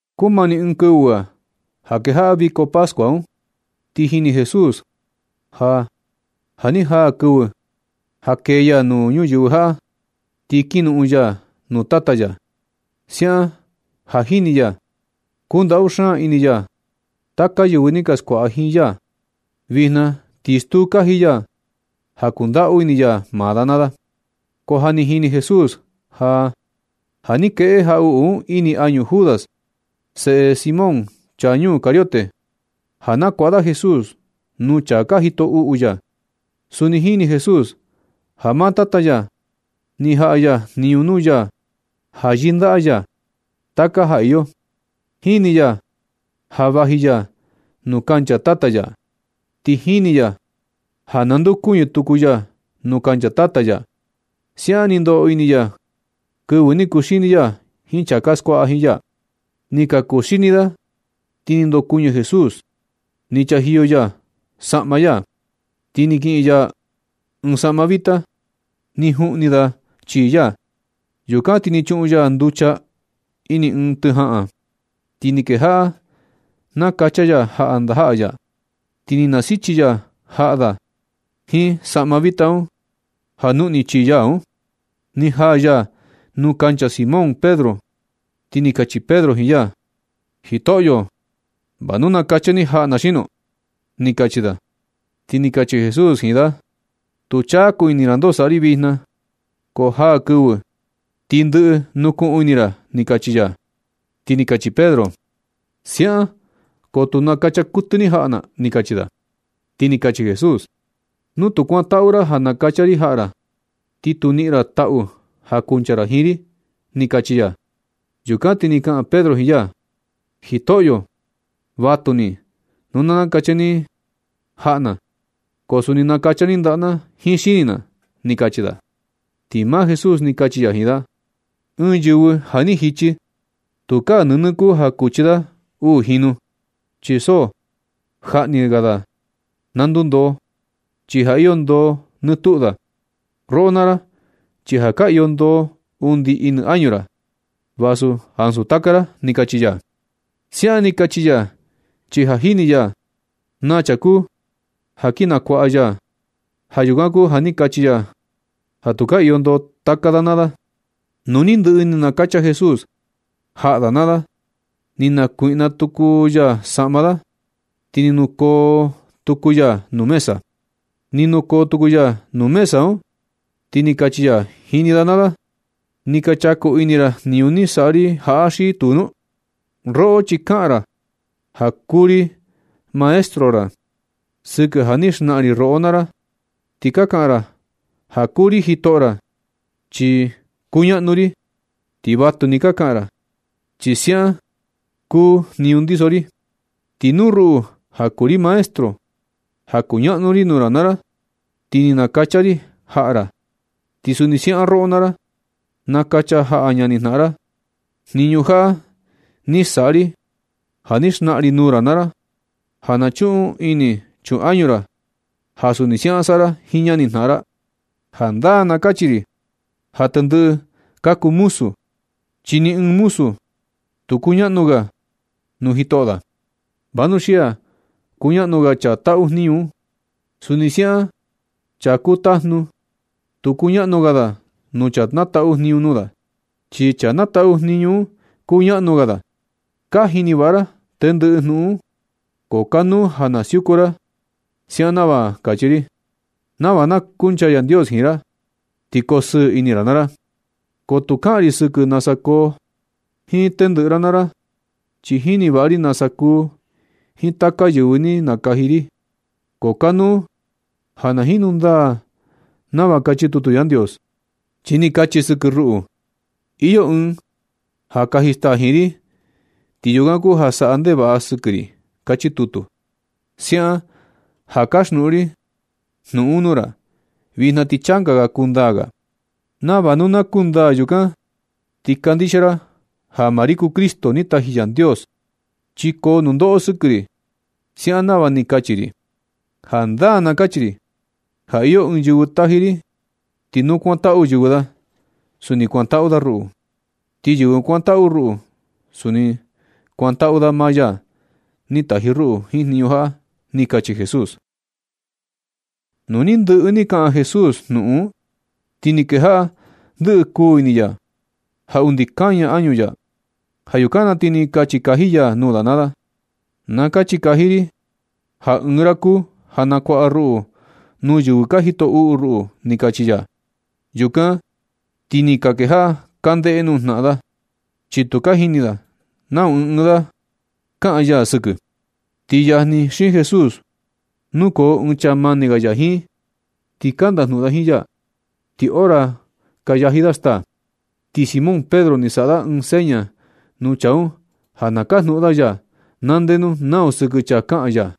Kumani ɨɨn kɨvɨ ga ja kejaꞌa viko pascua un. Ti jini Jesús ja, ja ni jaa kɨvɨ ja kee ya nuu ñuyɨvɨ jaꞌa ti kin noꞌon ya nuu Tata ya. Siaꞌan ja jini ya, kuu ndaꞌu xaan ini ya taka yɨvɨ ni ka skuaꞌa jiin ya. Vijna ti stuu kaji ya ja kundaꞌu ini ya maa da naa da. Ko ja ni jini Jesús ja, ja ni kueꞌe jaꞌuꞌu un ini añu Judas, seꞌe Simón, chaa ñuu Cariote, ja nakuaꞌa da Jesús nuu chaa ka jito uꞌu ya. Suni jini Jesús ja maa Tata ya ni jaꞌa jniñu nuu ya ja yɨndaꞌa ya taka ja iyo. Jini ya ja vaji ya nuu kancha Tata ya, ti jini ya ja nandeokuñɨ tuku ya nuu kancha Tata ya. Siaꞌan ni ndoꞌo ini ya kɨvɨ ni kuxini ya jiin chaa ka skuaꞌa jiin ya. Nɨ ka kuxini da ti ni ndokuɨñɨ Jesús. Ni chajiyo ya saꞌma ya, ti ni kiꞌin ya ɨɨn toalla. Ni juꞌni da chii ya. Yukan ti ni chuꞌun ya nducha ini ɨɨn tɨ jaꞌan, ti ni kejaꞌa nakacha ya jaꞌa ndajaꞌa ya. Ti nasichi ya jaꞌa da jiin toalla nuꞌni chii ya un. Ni jaa ya nuu kancha Simón Pedro, ti ni kachi Pedro jiin ya: ―Jitoꞌyo, ¿va nu nakacha ni jaꞌa na xino? ―ni kachi da. Ti ni kachi Jesús jiin da: ―Tu chaku ini ra ndoo saꞌa ri vijna, ko jaa kɨvɨ ti ndɨꞌɨ nukuꞌun ini ra ―ni kachi ya. Ti ni kachi Pedro: ―Siaꞌan ko tu nakacha kuɨtɨ ni jaꞌa na ―ni kachi da. Ti ni kachi Jesús: ―Nu tu kuantaꞌu ra ja nakacha ri jaꞌa ra, ti tu niꞌin ra taꞌu ja kuncha ra jiin ri ―ni kachi ya. Yukan ti ni kaꞌan Pedro jiin ya: ―Jitoꞌyo, vatuni nu na nakacha ni jaꞌa na, ko suni nakacha ni ndaꞌa na jiin xini na ―ni kachi da. Ti maa Jesús ni kachi ya jiin da: ―Ɨɨn yɨvɨ sa ni jichi, tukaa nɨnɨ kuu ja kuchi da uu jinu, chi so jaꞌa ni ga da na ndundoo, chi ja iyo ndoo nɨ tuꞌu da. Roꞌo naa ra, chi ja ka iyo ndoo undi ini añu ra, vasu ansu taka ra ―ni kachi ya. Siaꞌan ni kachi ya chi ja ni jini ya na chaa kuu ja kin nakuaꞌa ya. Ja yukan kuu ja ni kachi ya ja tu ka iyo ndoo taka da naa da. Nu ni ndɨꞌɨ ni nakacha Jesús jaꞌa da naa da, ni nakuiꞌna tuku ya saꞌma da, ti ni nukoo tuku ya nuu mesa. Ni nukoo tuku ya nuu mesa un, ti ni kachi ya jini da naa da: ―¿Ni ka chaku ini ra jniñu ni saꞌa ri jaꞌa xi tuu nu? Roꞌo chi ka kaꞌan ra ja kuu ri Maestro ra sɨkɨ ja ni xnaꞌan ri roꞌo ra naa ra. Ti ka kaꞌan ra ja kuu ri jitoꞌo ra, chi kuñaꞌnu ri. Ti vatuni ka kaꞌan ra, chi siaꞌan kuu jniñu ndiso ri. Ti nu ruꞌu ja kuu ri Maestro, ja kuñaꞌnu ri nuu ra naa ra, ti ni nakacha ri jaꞌa ra. Ti suni siaꞌan roꞌo naa ra, nakacha jaꞌa ñanijnaꞌan ra. Jniñu jaꞌa ni saꞌa ri ja ni xnaꞌan ri nuu ra naa ra ja na chun ini chun añu ra ja suni siaꞌan saꞌa ra jiin ñanijnaꞌan ra. Jandaa na kachi ri ja tendɨꞌɨ ka kuu muzu, chi ni ɨɨn muzu tu kuñaꞌnu ga da nuu jitoꞌo da. Vanuxia kuñaꞌnu ga chaa taꞌu jniñu un. Suni siaꞌan chaa kuu tajnu, tu kuñaꞌnu ga da ja kuu chaa nataꞌu jniñu nuu da, chi chaa nataꞌu jniñu un kuñaꞌnu ga da. Ka jini vaꞌa ra tendɨꞌɨ jnuꞌun. Ko kanuu ja na siuku ra siaꞌan nava kachi ri, nava na kunchaa Yandios jiin ra, ti kosɨɨ ini ra naa ra. Ko tu kaꞌan ri sɨkɨ nasa koo jiin tendɨꞌɨ ra naa ra. Chi jini vaꞌa ri nasa kuu jiin taka yɨvɨ ni nakaji ri, ko kanuu ja na jinu ndaa nava kachi tutu Yandios, chi ni kachi sɨkɨ ruꞌu: “Iyo ɨɨn ja kaji staa jiin ri, ti yukan kuu ja saꞌa ndevaꞌa sɨkɨ ri”, kachi tutu. Siaꞌan ja kaxnuꞌun ri jnuꞌun un nuu ra vijna ti changa ga kundaa ga. Nava nu na kundaa, yukan na ti kandixia ra ja maa ri kuu Cristo ni taji Yandios, chi koo nundoꞌo sɨkɨ ri siaꞌan nava ni kachi ri. Jandaa na kachi ri ja iyo yɨvɨ taji ri. Ti nu kuantaꞌu yɨvɨ da, suni kuantaꞌu da ruꞌu, ti yɨvɨ kuantaꞌu ruꞌu, suni kuantaꞌu da maa ya ni taji ruꞌu jiin jniñu jaꞌa ―ni kachi Jesús. Nu ni ndɨꞌɨ ni kaꞌan Jesús jnuꞌun un, ti ni kejaꞌa ndɨꞌɨ kuu ini ya ja undi kaña añu ya. Ja yukan na ti ni kachi kaji ya nuu da naa da: ―Na kachi kaji ri ja ɨɨn ra kuu ja nakuaꞌa ruꞌu nuu yɨvɨ ka jito uꞌu ruꞌu ―ni kachi ya. Yukan ti ni ka kejaꞌa ka ndeꞌe nuu jnaꞌan da, chi tu ka jini da nau ɨɨn ɨɨn da kaꞌan ya sɨkɨ. Ti yajni xiin Jesús nukoo ɨɨn chaa mani ga ya jiin, ti ka ndajnuꞌun da jiin ya ni hora ka yaji da staa. Ti Simón Pedro ni saꞌa da ɨɨn seña nuu chaa un ja na kajnuꞌun da ya na ndenu nau sɨkɨ chaa kaꞌan ya.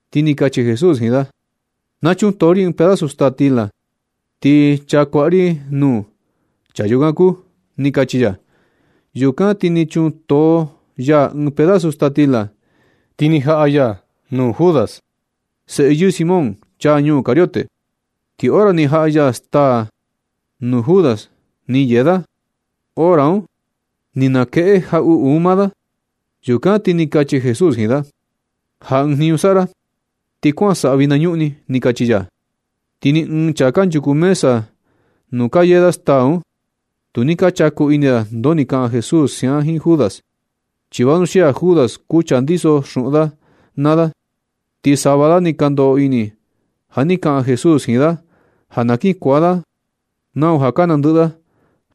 Ti ni kachi Jesús jiin da: ―Na chuntoo ri ɨɨn pedazu staa stila, ti chaa kuaꞌa ri nuu, chaa yukan kuu ―ni kachi ya. Yukan ti ni chuntoo ya ɨɨn pedazu staa stila, ti ni jaꞌa ya nuu Judas, seꞌe yɨɨ Simón, chaa ñuu Cariote. Ti hora ni jaꞌa ya staa un nuu Judas ni yee da, hora un ni nakueꞌe jaꞌuꞌu un maa da. Yukan ti ni kachi Jesús jiin da: ―Ja ɨɨn jniñu saꞌa ra, ti kuan saꞌa vinañuꞌni ―ni kachi ya. Ti ni ɨɨn chaa kanchuku mesa nuu ka yee da staa un, tu ni ka chaku ini da ndoo ni kaꞌan Jesús siaꞌan jiin Judas. Chi vanuxia Judas kuu chaa ndiso xuꞌun da naa da, ti sava da ni ka ndoꞌo ini ja ni kaꞌan Jesús jiin da ja na kin kuaan da nau ja ka nandɨꞌɨ da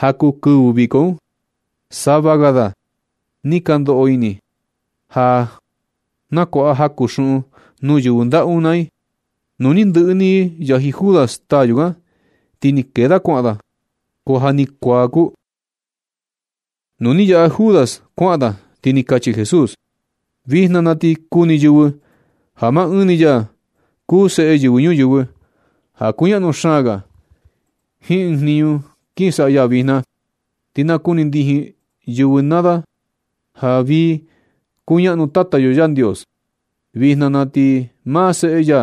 ja kuu kɨvɨ viko un. Sava ga da ni ka ndoꞌo ini ja na kuaꞌa jaku xuꞌun nuu yɨvɨ ndaꞌu un naa i. Nu ni ndɨꞌɨ ni yaji Judas staa yukan, ti ni kee da kuaꞌan da. Ko ja ni kuaa kuu. Nu ni yaꞌa Judas kuaꞌan da, ti ni kachi Jesús: ―Vijna na ti kuni yɨvɨ ja maa Ɨɨn ni ya kuu Seꞌe Yɨvɨ Ñuyɨvɨ, ja kuñaꞌnu xaan ga jiin ɨɨn jniñu kin saꞌa ya vijna. Ti na kuni ndijin yɨvɨ naa da ja vii kuñaꞌnu Tata yo Yandios. Vijna na ti maa Seꞌe ya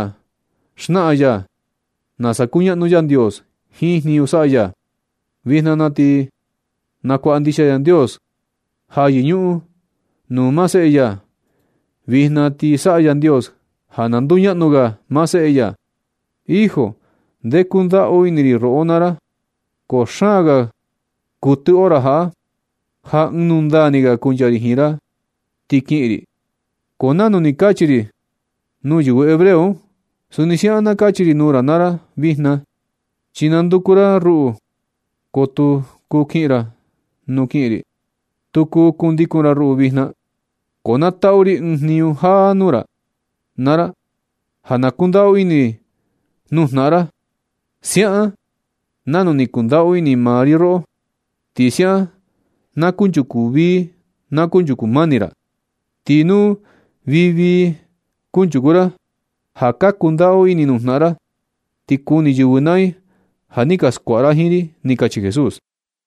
xnaꞌan nasa kuñaꞌnu Yandios jiin jniñu saꞌa ya. Vijna na ti nakuaꞌa ndixia Yandios ja yɨñuꞌun nuu maa Seꞌe ya. Vijna ti saꞌa Yandios ja na nduñaꞌnu ga maa Seꞌe ya. Hijo, ndee kundaꞌu ini ri roꞌo naa ra, ko xaan ga kuɨtɨ hora jaꞌa, ja ɨɨn nundaa ni ga kuncha ri jiin ra ti kiꞌin ri. Ko nanu ni kachi ri nuu yɨvɨ hebreo un, suni siaꞌan na kachi ri nuu ra naa ra vijna. Chi nanduku ra ruꞌu, ko tu kuu kiꞌin ra nuu kiꞌin ri. Tu kuu kundikun ra ruꞌu vijna. Ko na taꞌu ri ɨɨn jniñu jáá nuu ra naa ra, ja na kundaꞌu ini nuu jnaꞌan ra, siaꞌan nanu ni kundaꞌu ini maa ri roꞌo. Ti siaꞌan na kunchuku vii na kunchuku mani ra. Ti nu vii vii kanchuku ra, ja ka kundaꞌu ini nuu jnaꞌan ra, ti kuni yɨvɨ naa i ja ni ka skuaꞌa ra jiin ri ―ni kachi Jesús.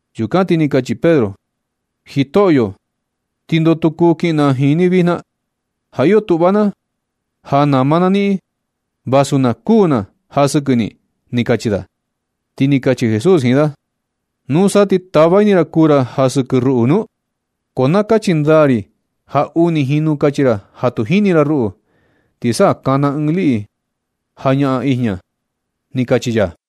Yukan ti ni kachi Pedro: ―Jitoꞌyo, ¿ti ndoo tu kuu kiꞌin na jiin ni vijna? Ja iyo tuꞌva na ja nama na niꞌin vasu na kuū na ja sɨkɨ ni ―ni kachi da. Ti ni kachi Jesús jiin da: ―¿Nusa ti tava ini ra kuu ra ja sɨkɨ ruꞌu nu? Ko na kachi ndaa ri ja uni jinu kachi ra ja tu jini ra ruꞌu, ti sa kana ɨɨn liꞌi ja ñaꞌan ijña ―ni kachi ya.